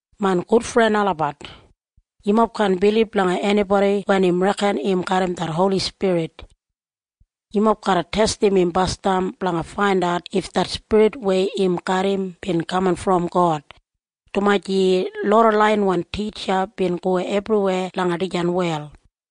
Main gudfren olabat, yumob kaan bilib langa enibodi wen im reken im garram det Holi Spirit. Yumob garra testim im basdam blanga faindat if det spirit weya im garram bin kaman brom God, dumaji loda laiyinwan titja bin go ebriweya langa dijan wel.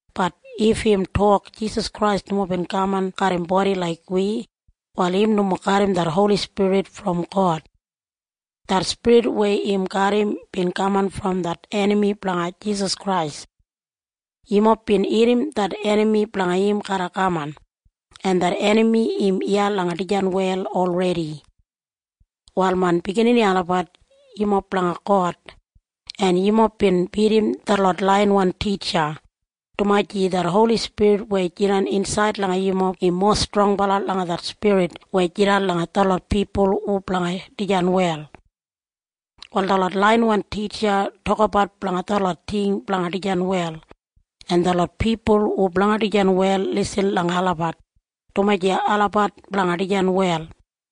Bat if im tok Jisas Krais nomo bin kaman garram bodi laik wi, wal im nomo garram det Holi Spirit brom God. Det spirit weya im garram bin kaman brom det enami blanga Jisas Krais. Yumob bin irrim det enami blanga im garra kaman, en det enami im iya langa dijan wel olredi. Wal main biginini olabat, yumob blanga God, en yumob bin bidim detlot laiyinwan titja, dumaji det Holi Spirit weya jidan insaid langa yumob im mowa strongbala langa det spirit weya jidan langa detlot pipul hu blanga dijan wel. Wal detlot laiyinwan titja tokabat blanga detlot ting blanga dijan wel, en detlot pipul hu blanga dijan wel lisin langa olabat, dumaji olabat blanga dijan wel.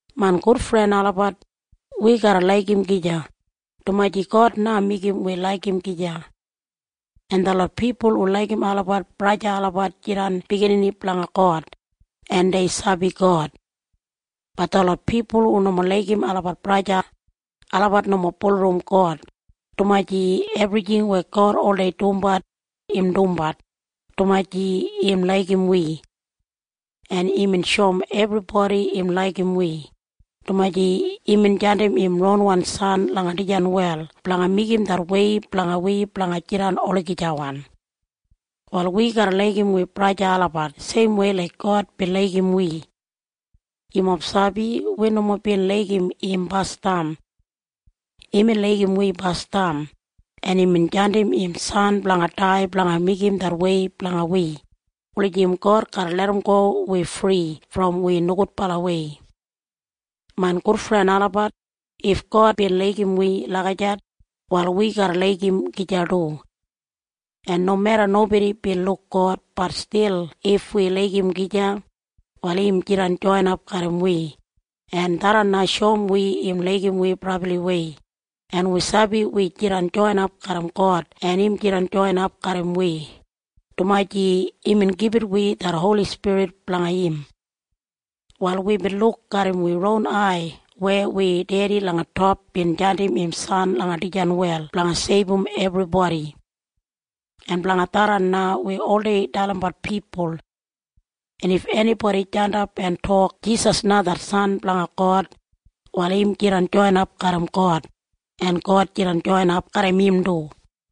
Main gudfren olabat, wi garra laigim gija, dumaji God na meigim wi laigim gija. En detlot pipul hu laigim olabat braja en sista olabat jidan biginini blanga God, en dei sabi God. Bat detlot pipul hu nomo laigim olabat braja o sista, olabat nomo bulurrum God, dumaji ebrijing weya God oldei dumbat, im dumbat, dumaji im laigim wi. En imbin shoum ebribodi im laigim wi, dumaji imbin jandim im ronwan San langa dijan wel blanga meigim det wei blanga wi blanga jidan olagijawan. Wal wi garra laigim wi braja en sista olabat seimwei laik God bin laigim wi. Yumob sabi? Wi nomo bin laigim im basdam. Imbin laigim wi basdam, en imbin jandim im San blanga dai blanga meigim det wei blanga wi, wulijim God garra larramgo wi fri brom wi nogudbalawei. Main gudfren olabat, if God bin laigim wi lagijat, wal wi garra laigim gija du. En nomeda nobodi bin luk God, bat stil if wi laigim gija, wal im jidan joinap garram wi, en tharran na shoum wi im laigim wi brabliwei, en wi sabi wi jidan joinap garram God en im jidan joinap garram wi, dumaji imbin gibit wi det Holi Spirit blanga im. Wal wibin luk garram wi ron ai weya wi Dedi langa top bin jandim im San langa dijan wel blanga seibum ebribodi. En blanga tharran na wi oldei dalimbat pipul. En if enibodi jandap en tok Jisas na det San blanga God, wal im jidan joinap garram God, en God jidan joinap garram im du.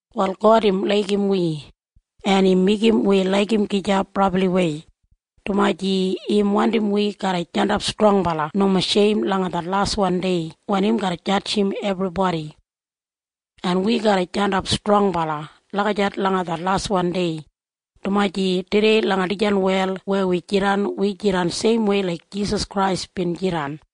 Wal God im laigim wi, en im meigim wi laigim gija brabliwei, dumaji im wandim wi garra jandap strongbala nomo sheim langa det laswan dei wen im garra jadjim ebribodi. En wi garra jandap strongbala lagijat langa det laswan dei, dumaji tudei langa dijan wel weya wi jidan, wi jidan seimwei laik Jisas Krais bin jidan.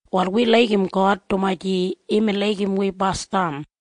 Wal wi laigim God dumaji imbin laigim wi basdam.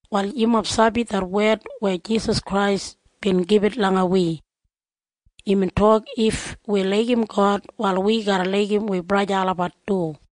Wal yumob sabi det wed weya Jisas Krais bin gibit langa wi. Imbin tok if wi laigim God, wal wi garra laigim wi braja en sista olabat du.